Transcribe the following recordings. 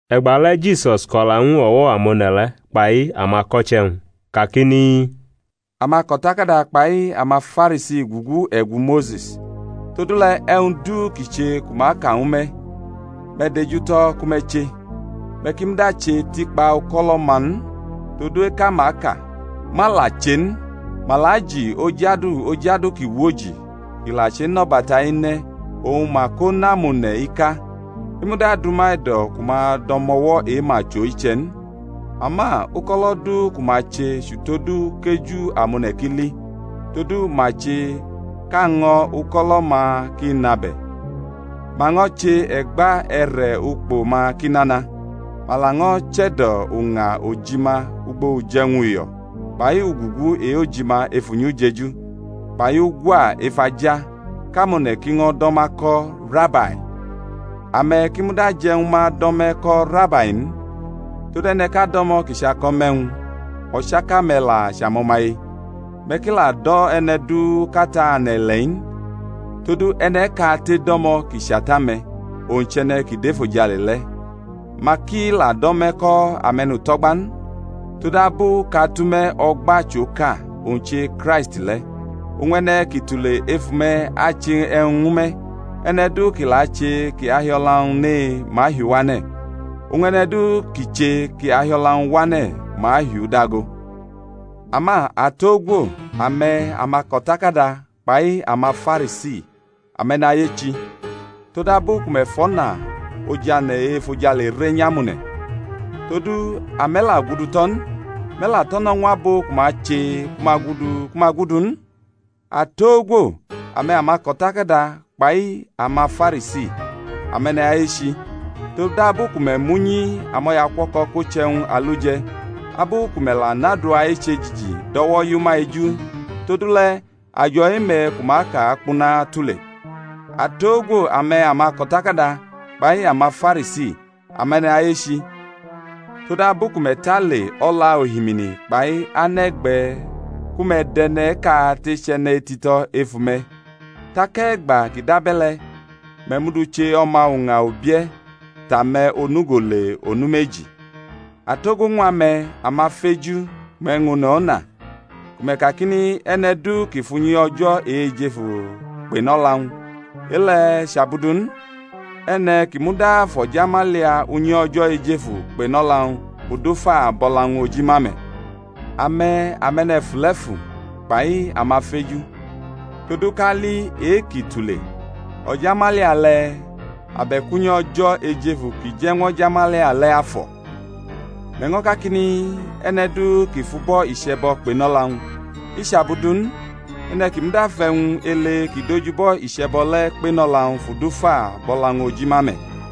E̩gbale̩ Jisus ko̩la ñw o̩wo̩ amone̩ le̩ kpai amako̩che̩-wñ, kakini, Amako̩takada kpai amaFarisi gugu e̩gu Mose̩s; todule̩ e̩wñ du ki che ku ma ka ñwu me̩, me̩ dejutʼo̩ ku me̩ che; me̩ ki muda che tikpa uko̩lo̩-ma n, todu eka ma ka, ma la che n. Ma la ji oj adu oj adu ki woji ki la chenʼo̩bata e̩ne̩, oñ ma kʼo nʼamone̩ ika; i muda dʼuma e̩do̩ ku ma dʼo̩mo̩wo̩ e-ma chʼo iche̩ n. Ama uko̩lo̩ du ku ma che chʼutodu kʼeju amone̩ ki li; todu ma che kʼaño̩ uko̩lo̩-ma ki nʼabe̩, ma ño̩ che e̩gba e̩re̩ ukpo-ma ki nana, ma laño̩ che̩do̩ uña ojima ugbo uje̩wñ uyo̩, kpai ugugu e-ojima ef unyi ujeju, kpai ugwa ef aja, kʼamone̩ ki ño̩ do̩ ma ko̩, Rabai. Ame̩ ki muda je̩ ñwu ma do̩ me̩ ko̩ Rabai n: todu e̩ne̩ʼka do̩mo̩ kʼi chʼako̩ me̩ e̩wñ; o̩chaka-me̩ la chʼamo̩maye. Me̩ ki la do̩ e̩ne̩ du kʼata ane̩-ile̩-i n, todu e̩ne̩ʼkate do̩mo̩ kʼi chʼata-me̩, owñ chʼe̩ne̩ kʼi dʼefojale le̩. Ma ki la do̩ me̩ ko̩ ame̩nuto̩gba n, todabu kʼAtʼume̩ o̩gba chʼoka, owñ che Kraisti le̩. Oñ e̩ne̩ ki tule ef ume̩ ache e̩wñ ñwu me̩. E̩ne̩ du ki la che kʼi ahi o̩la-wñ ne ma ahiʼu wane̩; oñ e̩ne̩ du ki che kʼi ahi o̩la-wñ wane̩ ma ahiʼu dago. Ama atogwo, ame̩, amako̩takada kpai amaFarisi, ame̩nayechi! todabu ku me̩ fʼo̩na ojane̩ e-efojale re nyʼamone̩; todu ame̩ la gudu tʼo̩ n, me̩ la tʼo̩ no̩ ñw abo ku ma che ku ma gudu ku ma gudu n. [ Atogwo, ame̩, amako̩takada kpai amaFarisi, ame̩nayechi! todabu ku me̩ mʼunyi amo̩yaukuo̩ko̩ ko che e̩wñ aluje̩, abu ku me̩ la nʼadua eche jiji dʼo̩wo̩ yʼuma eju todule̩ ajo̩ e-me̩ ku ma aka akpuna tule.] Atogwo, ame̩ amako̩takada kpai amaFarisi, ame̩nayechi todabu ku me̩ tale o̩la ohimini kpai ane̩ e̩gbe̩ ku me̩ dʼe̩ne̩ kate chʼe̩ne̩ tito̩ ef ume̩; tak e̩gba kʼi dʼabe̩le̩, me̩ mʼu du che o̩ma uña ubie̩ tʼame̩ onugo le onu meji. Atogwo ñw ame̩, amafeju ku me̩ ñʼone̩ o̩na, ku me̩ kakini, E̩ne̩ du ki fʼunyi O̩jo̩ e-ejefu kpenʼo̩la-wñ, e-le̩ chʼabu du n; e̩ne̩ ki muda fʼo̩jamalia unyi O̩jo̩ ejefu kpe̩nʼo̩la-wñ fʼudu fa bʼo̩la-wñ oji ma me̩. Ame̩, ame̩ne̩fule̩fu kpai amafeju: todu kali e-ki tule, o̩jamalia le̩? abe̩k unyi O̩jo̩ ejefu kʼije̩ñw o̩jamalia le̩ afo̩? Me̩ ño̩ kakini, E̩ne̩ du ki fʼubo̩ iche̩bo̩ kpenʼo̩la-wñ, i chʼabu du n; e̩ne̩ ki muda fʼe̩wñ ele ki dʼoj ubo̩ iche̩bo̩ le̩ kpenʼo̩la-wñ fʼudu fa bʼo̩la-wñ oji ma me̩.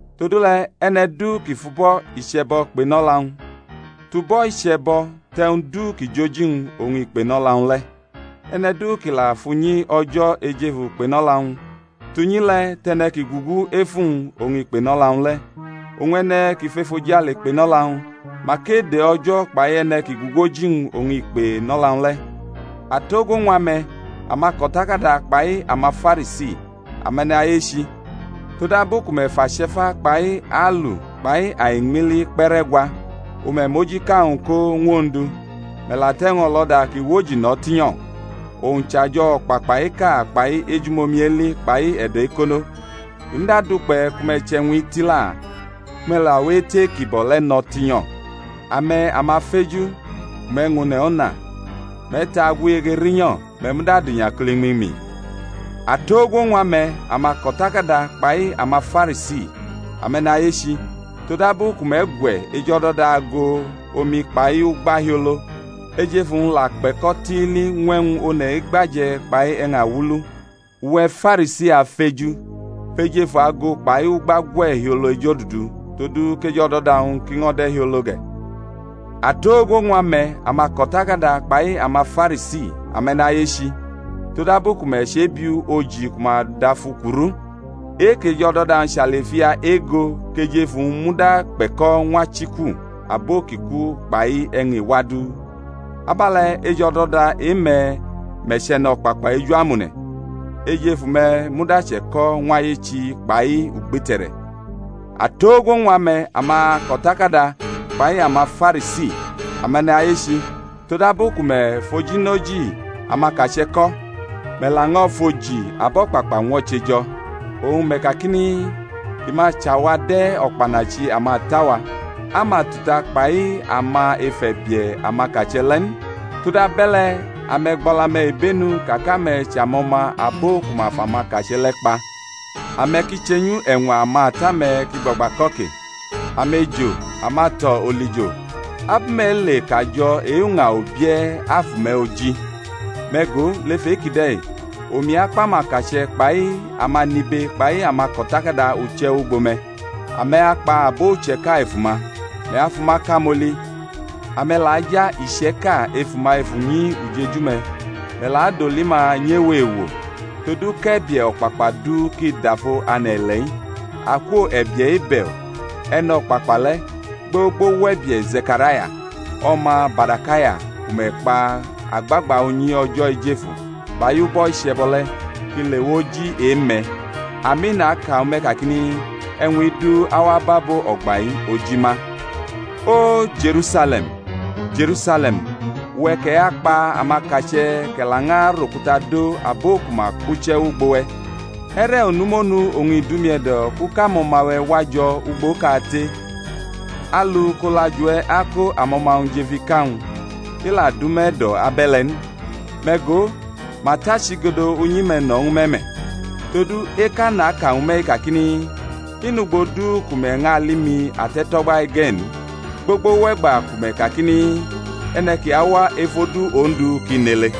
Todule̩ e̩ne̩ du ki fʼubo̩ iche̩bo̩ kpenʼo̩la-wñ, tʼubo̩ iche̩bo̩ tʼe̩wñ du ki jʼoji-wñ oñ i kpenʼo̩la-wñ le̩. E̩ne̩ du ki la fʼunyi O̩jo̩ ejefu kpenʼo̩la-wñ, tʼunyi le̩ tʼe̩ne̩ ki gugu ef uwñ oñ i kpenʼo̩la-wñ le̩. Oñ e̩ne̩ ki fʼefojale kpenʼo̩la-wñ, mak ede O̩jo̩ kpai e̩ne̩ ki gugu oji-wñ oñ i kpenʼo̩la-wñ le̩. Atogwo ñw ame̩, amako̩takada kpai amaFarisi, ame̩nayechi! todabu ku me̩ fʼache̩fa kpai aulu kpai aiñmili kpe̩ rʼe̩gwa, oñ me̩ mʼojiʼka-wñ ko ñw Ondu; me̩ la tʼe̩wñ o̩lo̩da ki woji no̩ tinyo̩, owñ chʼajo̩ o̩kpakpa eka kpai ejumomi eli kpai e̩do̩ ekono. I muda dukpe̩ ku me̩ chʼe̩wñ-i tila, ku me̩ la we etʼe-kibo̩ le̩ no̩ tinyo̩. Ame̩, amafeju ku me̩ ñʼone̩ o̩na, me̩ ta agwiyege rinyo̩, me̩ muda adʼinyakulumi mi! Atogwo ñw ame̩, amako̩takada kpai amaFarisi, ame̩nayechi! todabu ku me̩ gwe̩ ejo̩do̩da ago omi kpai ugba hiolo, ejefu-wñ la kpe̩ko̩ tiili ñw e̩wñ one̩ egba je̩ kpai e̩wñ awulu. Uwe̩ Farisi, afeju, fʼejefu ago kpai ugba gwe̩ hiolo ejodudu, todu kʼej o̩do̩da-wñ ki ño̩ de̩ hiolo ge̩. Atogwo ñw ame̩, amako̩takada kpai amaFarisi, ame̩nayechi! todabu ku me̩ chebiu oji ku ma dʼafu kuru, e-kʼej o̩do̩da-wñ chʼalifia ego kʼej ef uwñ muda kpe̩ko̩ ñw achiku abo ki ku kpai e̩wñ iwa du. Abe̩le̩ ej o̩do̩da e-me̩ me̩ chʼe̩no̩kpakpa eju amone̩; ej ef ume̩ muda che̩ko̩ ñw ayechi kpai ugbite̩re̩. Atogwo ñw ame̩, amako̩takada kpai amaFarisi, ame̩nayechi! todabu ku me̩ fʼojinoji amakache̩ ko̩, me̩ laño̩ fʼoji abo o̩kpakpa ñwo̩che jo̩; oñ me̩ kakini, I ma chʼawa de̩ o̩kpanachi amata-wa, a ma tuta kpai ama ef e̩bie̩ amakache̩ le̩ n. Todabe̩le̩, ame̩ gbʼo̩la-me̩ ibenu ka kʼame̩ chʼamo̩ma abo ku ma fʼamakache̩ le̩ kpa. Ame̩ ki chenyu e̩ñwa amata-me̩ kʼi gbagba ko̩ ke. Amejo, amato̩ olijo! abu me̩ ale kʼajo̩ e-uña ubie̩ afʼume̩ oji? Me̩ go, lef e-kide̩ omi akpʼamakache̩ kpai amanibe kpai amako̩takada uche̩ wʼugbo me̩: ame̩ akpa abo iche̩ka ef uma, me̩ afʼuma kamoli; ame̩ la aja iche̩ka ef uma ef unyi ujeju-me̩, me̩ la adoli ma nyʼewo ewo: todu kʼe̩bie̩ o̩kpakpa du kʼi dafo ane̩-ile̩-i, akwo e̩bie̩ Ebe̩l, e̩no̩kpakpa le̩, gbogbo wʼe̩bie̩ Ze̩karaya, o̩ma Barakaya ku me̩ kpa agbagba unyi O̩jo̩ ejefu kpai ubo̩ iche̩bo̩ le̩, kʼi lewʼoji e-me̩. Ami, naka ñwu me̩ kakini, E̩wñ-i du awa bʼabo o̩gba-i oji ma. O, Je̩rusale̩m, Je̩rusale̩m, uwe̩ kʼe̩ akpa amakache̩ kʼe̩ lañʼarʼokuta do abo ku ma kpuche̩ wʼugbo-we̩, e̩re̩ onu monu oñ i dʼumi e̩do̩ kʼu kʼamo̩ma-we̩ wa jo̩ ugbokate, alu kʼolajuwe̩ ako amo̩ma-wñ jʼef ika-wñ; i la dʼume̩ e̩do̩ abe̩le̩ n. Me̩ go, ma tʼachigodo unyi-me̩ no̩ ñwu me̩ me̩. Todu, eka naka ñwu me̩-i kakini, I nʼugbo du ku me̩ ñʼali mi ate̩tʼo̩gba-i ge̩ n, gbogbo wʼe̩gba ku me̩ kakini, E̩ne̩ ki awa ef odu Ondu ki nʼele.